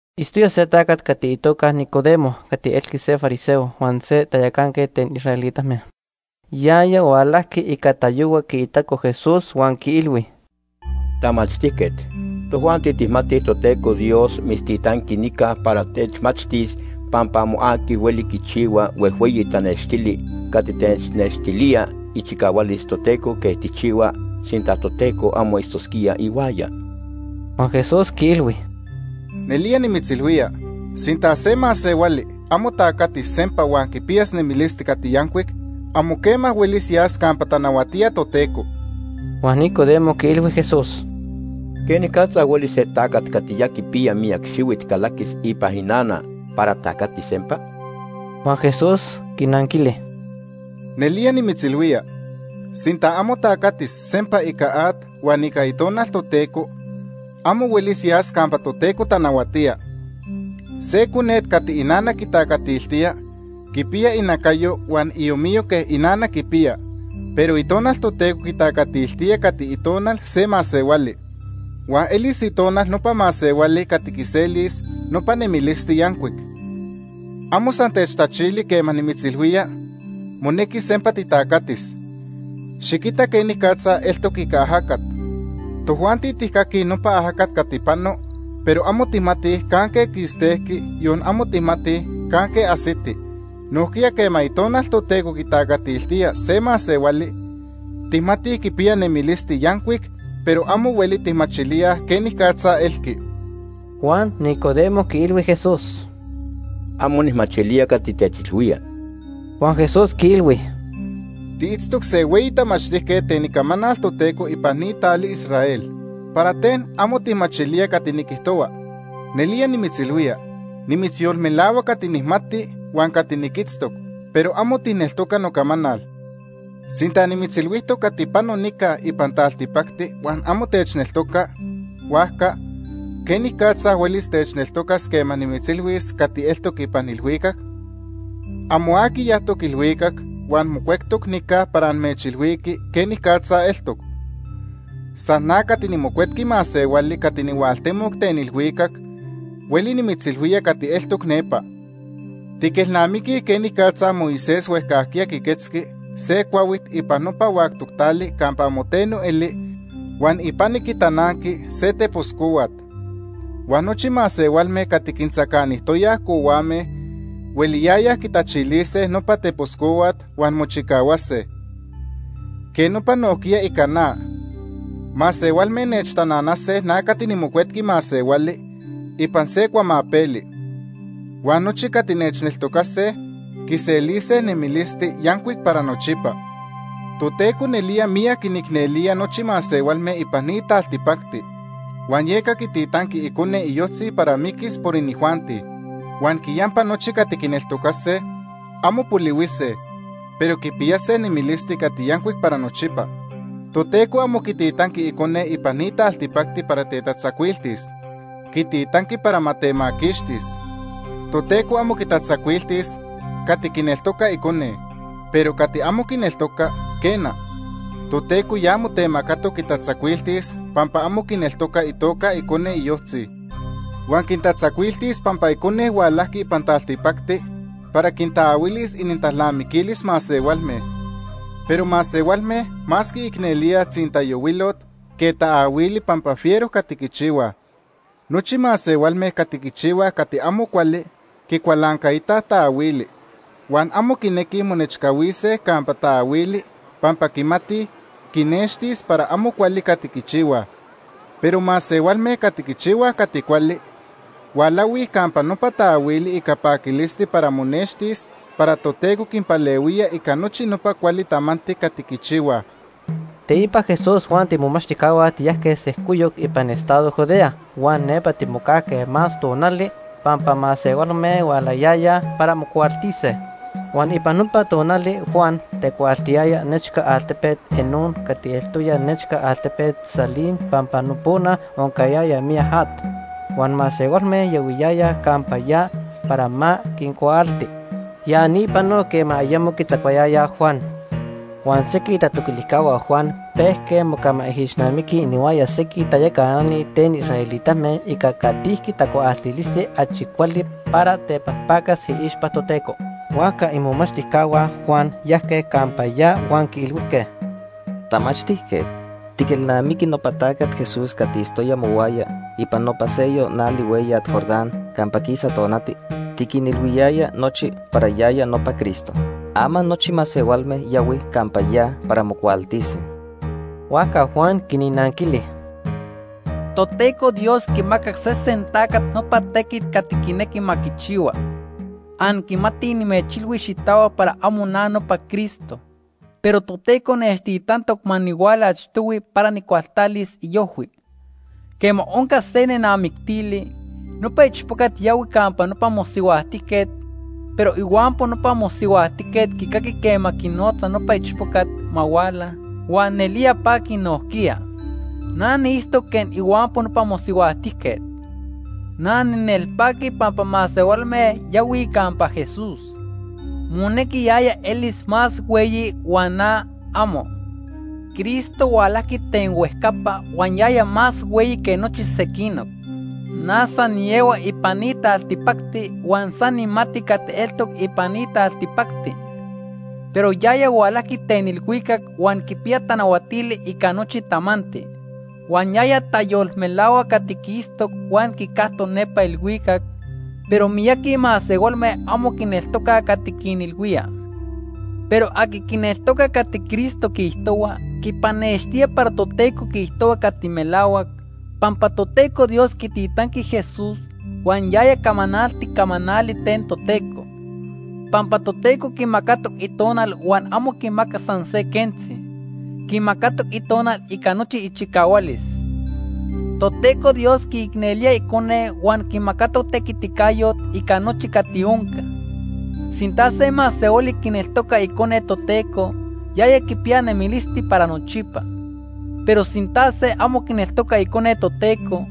Itztoya se tacat itoca Nicodemo cati elqui se fariseo huan se tayacanquet ten israelitame. Yaya hualajqui ica tayohua quiitaco Jesús huan quiilhui: ―Tamachtijquet, tojuanti tijmatij Toteco Dios mitztitanqui nica para techmachtis pampa amo aqui hueli quichihua huejhueyi tanextili cati technextilía ichicahualis Toteco quej tijchihua sinta Toteco amo itztosquía ihuaya. Huan Jesús quiilhui: ―Nelía nimitzilhuía, sinta se masehuali amo tacatis sempa huan quipiyas nemilisti cati yancuic, amo quema huelis yas campa tanahuatía Toteco. Huan Nicodemo quiilhui Jesús: ―¿Quenicatza hueli se tacat cati ya quipiya miyac xihuit calaquis ipan inana para tacatis sempa? Huan Jesús quinanquili: ―Nelía nimitzilhuía, sinta amo tacatis sempa ica at huan ica Itonal Toteco, amo huelis yas campa Toteco tanahuatía. Se conet cati inana quitacatiltía quipiya inacayo huan iomiyo quej inana quipiya. Pero Itonal Toteco quitacatiltía cati itonal se masehuali. Huan elis itonal nopa masehuali cati quiselis nopa nemilisti yancuic. Amo san techtachili quema nimitzilhuía monequi sempa titacatis. Xiquita quenicatza eltoc ica ajacat. Tojuanti tijcaquij nopa ajacat cati pano, pero amo tijmatij canque quistejqui, yon amo tijmatij canque ajsiti. Nojquiya quema Itonal Toteco quitacatiltía se masehuali, tijmatij quipiya nemilisti yancuic, pero amo hueli tijmachilíaj quenicatza elqui. Huan Nicodemo quiilhui Jesús: ―Amo nijmachilía cati techilhuía. Huan Jesús quiilhui: ―Tiitztoc se hueyi tamachtijquet ten Icamanal Toteco ipan ni tali Israel. ¿Para ten amo tijmachilía cati niquijtohua? Nelía nimitzilhuía, nimitzyolmelahua cati nijmati huan cati niquitztoc, pero amo tijneltoca nocamanal. Sinta nimitzilhuijtoc cati pano nica ipan taltipacti huan amo techneltoca, huajca ¿quenicatza huelis techneltocas quema nimitzilhuis cati eltoc ipan ilhuicac? “Amo aqui yajtoc ilhuicac huan mocuectoc nica para amechilhuiqui quenicatza eltoc. San na cati niMocuetqui Masehuali cati nihualtemoc ten ilhuicac hueli nimitzilhuía cati eltoc nepa. Tiquelnamiquij quenicatza Moisés huejcajquiya quiquetzqui se cuahuit ipan nopa huactoc tali campa amo teno eli huan ipani quitananqui se tepos cohuat. Huan nochi masehualme cati quintzacanijtoyaj cohuame hueliyayaj quitachilise nopa tepos cohuat huan mochicahuase. Quej nopa nojquiya ica na. Masehualme nechtananase na cati niMocuetqui Masehuali ipan se cuamapeli. Huan nochi cati nechneltocase quiselise nemilisti yancuic para nochipa.” Toteco nelía miyac quinicnelía nochi masehualme ipan ni taltipacti huan yeca quititanqui Icone iyojtzi para miquis por inijuanti. Huan quiyampa nochi cati quineltocase, amo polihuise, pero quipiyase nemilisti cati yancuic para nochipa. Toteco amo quititanqui Icone ipan ni taltipacti para tetatzacuiltis. Quititanqui para ma temaquixtis. Toteco amo quitatzacuiltis cati quineltoca Icone. Pero cati amo quineltoca, quena, Toteco ya motemacatoc quitatzacuiltis pampa amo quineltoca itoca Itequiticayo. Icone iyojtzi. Huan quitatzacuiltis pampa Icone hualajqui ipan taltipacti para quitaahuilis inintalnamiquilis masehualme, pero masehualme más quiicnelíaj tzintayohuilot que taahuili pampa fiero cati quichihuaj. Nochi masehualme cati quichihuaj cati amo cuali quicualancaitaj taahuili huan amo quinequij monechcahuise campa taahuili pampa quimatij quinextis para amo cuali cati quichihuaj. Pero masehualme cati quichihuaj cati cuali, hualahuij campa nopa taahuili ica paquilisti para monextis para Toteco quinpalehuía ica nochi nopa cuali tamanti cati quichihuaj. Teipa Jesús huan tiimomachtijcahua tiyajque sejcoyoc ipan estado Judea huan nepa timocajque más tonali pampa masehualme hualayayaj para mocuaaltise. Huan ipan nopa tonali Juan tecuaaltiyaya nechca altepet Enón cati eltoya nechca altepet Salim pampa nopona oncayaya miyac at, huan masehualme yahuiyayaj campa ya para ma quincuaalti. Ya ni panoc quema ayemo quitzacuayayaj Juan. Huan sequij itatoquilijcahua Juan pejque mocamaijixnamiquij inihuaya sequij tayacanani ten israelitame ica catijqui tacuaaltilisti achi cuali para tepajpacas iixpa Toteco. Huajca imomachtijcahua Juan yajque campa ya huan quiilhuijque: ―Tamachtijquet, ¿tiquelnamiqui nopa tacat Jesús cati itztoya mohuaya ipan nopa seyoc nali hueyat Jordán campa quisa tonati? Tiquinilhuiyaya nochi para yaya nopa Cristo. Ama nochi masehualme yahuij campa ya para mocuaaltise. Huajca Juan quinnanquili: ―Toteco Dios quimaca sesen tacat nopa tequit cati quinequi ma quichihua. Anquimatij nimechilhui xitahuac para amo na nopa Cristo, pero Toteco nechtitantoc ma nihuala achtohui para nijcualtalis iojhui. Quema onca se nenamictili, nopa ichpocat yahui campa nopa mosihuajtijquet, pero ihuampo nopa mosihuajtijquet quicaqui quema quinotza nopa ichpocat ma huala, huan nelía paqui nojquiya. Na niitztoc quej ihuampo nopa mosihuajtijquet. Na ninelpaqui pampa masehualme yahuij campa Jesús. Monequi yaya elis más hueyi huan na, amo. “Cristo hualajqui ten huejcapa huan yaya más hueyi que nochi sequinoc. Na san niehua ipan ni taltipacti huan san nijmati cati eltoc ipan ni taltipacti. Pero yaya hualajqui ten ilhuicac huan quipiya tanahuatili ica nochi tamanti. Huan yaya tayolmelahua cati quiitztoc huan quicactoc nepa ilhuicac, pero miyaqui masehualme amo quineltocaj cati quinilhuía. Pero aqui quineltoca cati Cristo quiijtohua, quipanextía para Toteco quiijtohua cati melahuac, pampa Toteco Dios quititanqui Jesús huan yaya camanalti camanali ten Toteco. Pampa Toteco quimacatoc Itonal huan amo quimacac san se quentzi. Quimacatoc Itonal ica nochi ichicahualis. Toteco Dios quiicnelía Icone huan quimacatoc tequiticayot ica nochi cati onca. Sinta se masehuali quineltoca Icone Toteco, yaya quipiya nemilisti para nochipa. Pero sinta se amo quineltoca Icone Toteco,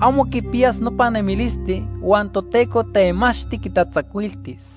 amo quipiyas nopa nemilisti, huan Toteco temachti quitatzacuiltis.”